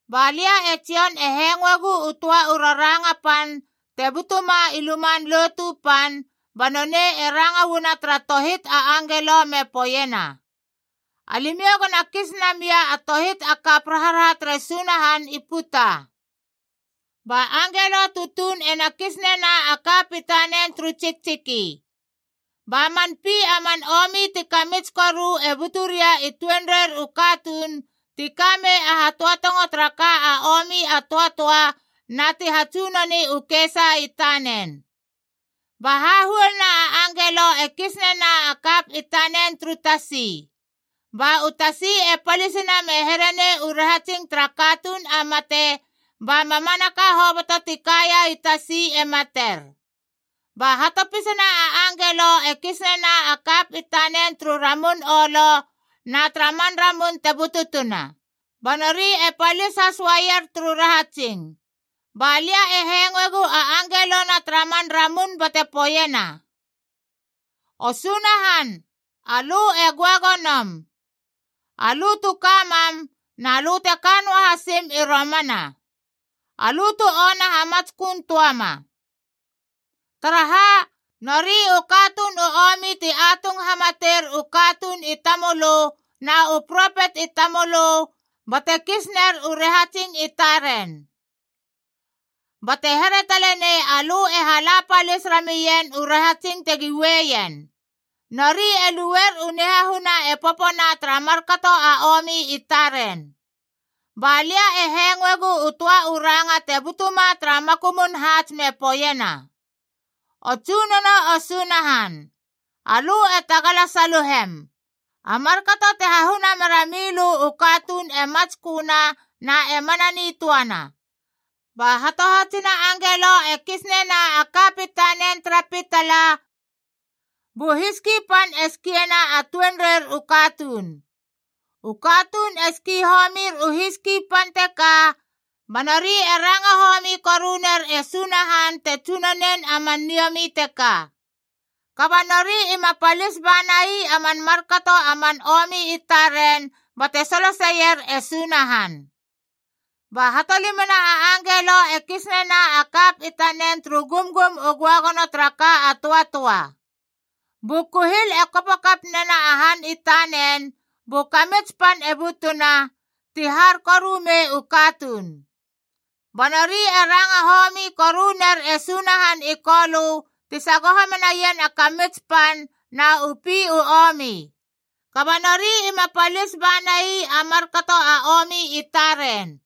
Ba lia e Jon e hengoegu u töa u raranga pan te butuma i Luman Lotu Pan, ba nonei e ranga uana tara tohit a angelo me poeiena, “Alimiou go na kis namia a tohit a kap raharaha tere Sunahan i puta!” Ba angelo tutuun e na kis nena a kap i tanen turu tsiktsiki. Ba man pi a man omi ti kamits koru e buturia i tuenreir u katuun ti ka mei a hatöatongo tara ka a omi a töatöa na ti hatsunoni u kesa i tanen. Ba hahuoluna a angelo e kis nena a kap i tanen turu tasi. Ba u tasi e palisina me here nei u rahatsing tara katuun a mate, ba mamanaka hoboto ti kaia i tasi e mater. Ba hatopisana a angelo e kis nena a kap i tanen turu ramun olo na tara man ramun te bututuna ba nori e palis has uaier turu rahatsing. Ba lia e hengoegu a angelona tara man ramun bate poeiena: “O Sunahan, alö e göagonom, alö tu ka mam na lö te ka noa hasim i romana. Alö tu ona hamatsköön töama. Taraha, nori u katuun u omi ti atung hamater u katuun i tamölö na u propet i tamölö bate kis ner u rahatsing i taren. Bate here tale nei alö e hala palis ramien u rahatsing tegi ueien.a Nori e lueier u nihahuna e popona tara markato a omi i taren.” Ba lia e hengoegu u töa u ranga te butuma tara makumun haats me poeiena: “O Tsunono, o Sunahan. Alö e tagala saluhem! A markato te hahuna mera mei lö u katuun e matsköna na e mana nitöana!” Ba hatohatsina a angelo e kis nena a kap i tanen tara pitala, bu hiski pan e skiena a tuenreir u katuun. U katuun e ski homir u hiski pan teka, ba nori e ranga homi koru ner e Sunahan te tsunonin a man niomi teka. Kaba nori ima palis bana ii a man markato a man omi i taren bate soloseier e Sunahan. Ba hatolimana angelo e kis nena a kap i tanen turu gumgum u göagono tara ka a omi a töatöa. Bu kuhil e kopo kap nena a han i tanen, bu kamits pan e butuna, ti har koru mei u katuun. Ba nori e ranga homi koru ner e Sunahan i Kolö ti sagoho menaien a kamits pan na u pi u omi. Kaba nori ima palis bana ii a markato a omi i taren.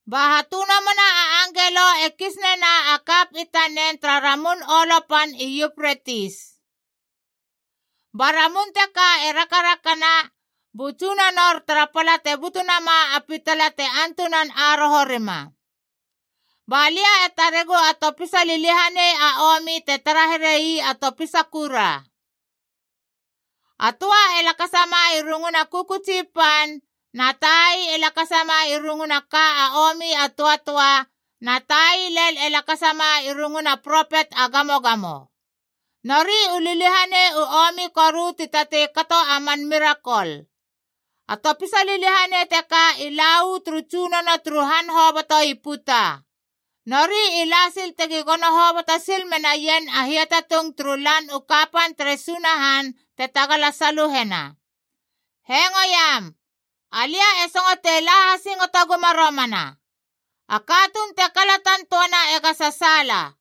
Ba hatönomona a angelo e kis nena a kap i tanen tara ramun olo pan i Yupretis. Ba ramun teka e rakarakana bu tsunonor tara pala te butu nama a pitala te antunan aroho rima. Ba lia e taregu a topisa liliahanei a omib te tara here ii a topisa kura. A töa e lakasama i runguna kökötsi pan, na tai e lakasama i runguna a ka a omi a töatöa, na tai lel e lakasama i runguna propet a gamogamo. Nori u liliahanei u omi koru ti tatei kato a man mirakol. A topisa liliahanei teka i la uu turu tsunono turu han hoboto i puta. Nori i la sil tegi gono hoboto sil menaien a hiatatung turu Lan u Kapan tere Sunahan te tagala saluhena. “Hengo iam!c Alia e songotei la hasingoto guma romana.d A katuun te kalatan töana ega sasaala.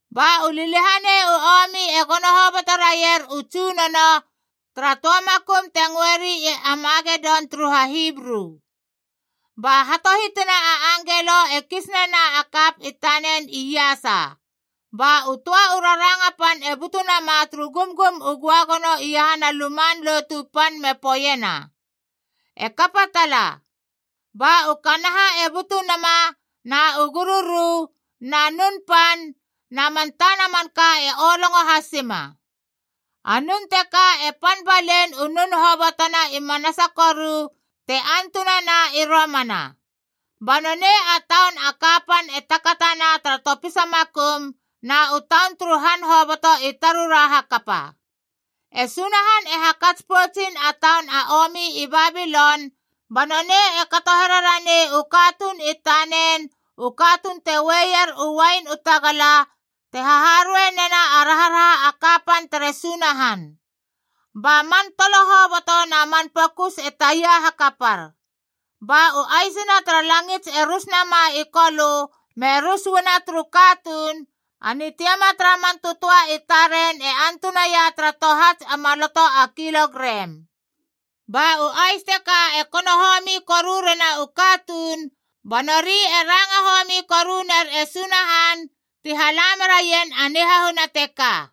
Ba u liliahanei u omi e gono hoboto raier u tsunono tara töa makum te ngöeri i Amagedon turu HaHibru. Ba hatohitina a angelo e kis nena a kap i tanen iasa. Ba u töa u raranga pan e butu nama turu gumgum u göagono iahana Luman Lotu Pan me poeiena, “E kapa tala!” Ba u kanaha e butu nama, na u gururu, na nun pan, na man tana manka e olongo hasima. A nun teka e pan balein u nun hobotona i manasa koru te antunana i romana. Ba nonei a taun a kapanf e takatana tara topisa makum, na u taun turu han hoboto i tarura hakapa. E Sunahan e hakats poutsin a taun a omi i Babilon, ba nonei e kato here ranei u katuun i tanen u katuun te ueier u uain u tagala te haharuei nena a raharaha a kapan tere Sunahan. Ba a man tolo hoboto na man pokus e taia hakapar. Ba u aisina tara langits e rus nama i kolö me rus uana turu katuun, a nitiama tara man tötöa i taren e antunaia tara tohats a maloto a kilogrem. Ba u ais teka e kono homi koru rena u katuun, ba nori e ranga homi koru ner e Sunahan ti hala meraien a nihahuna teka.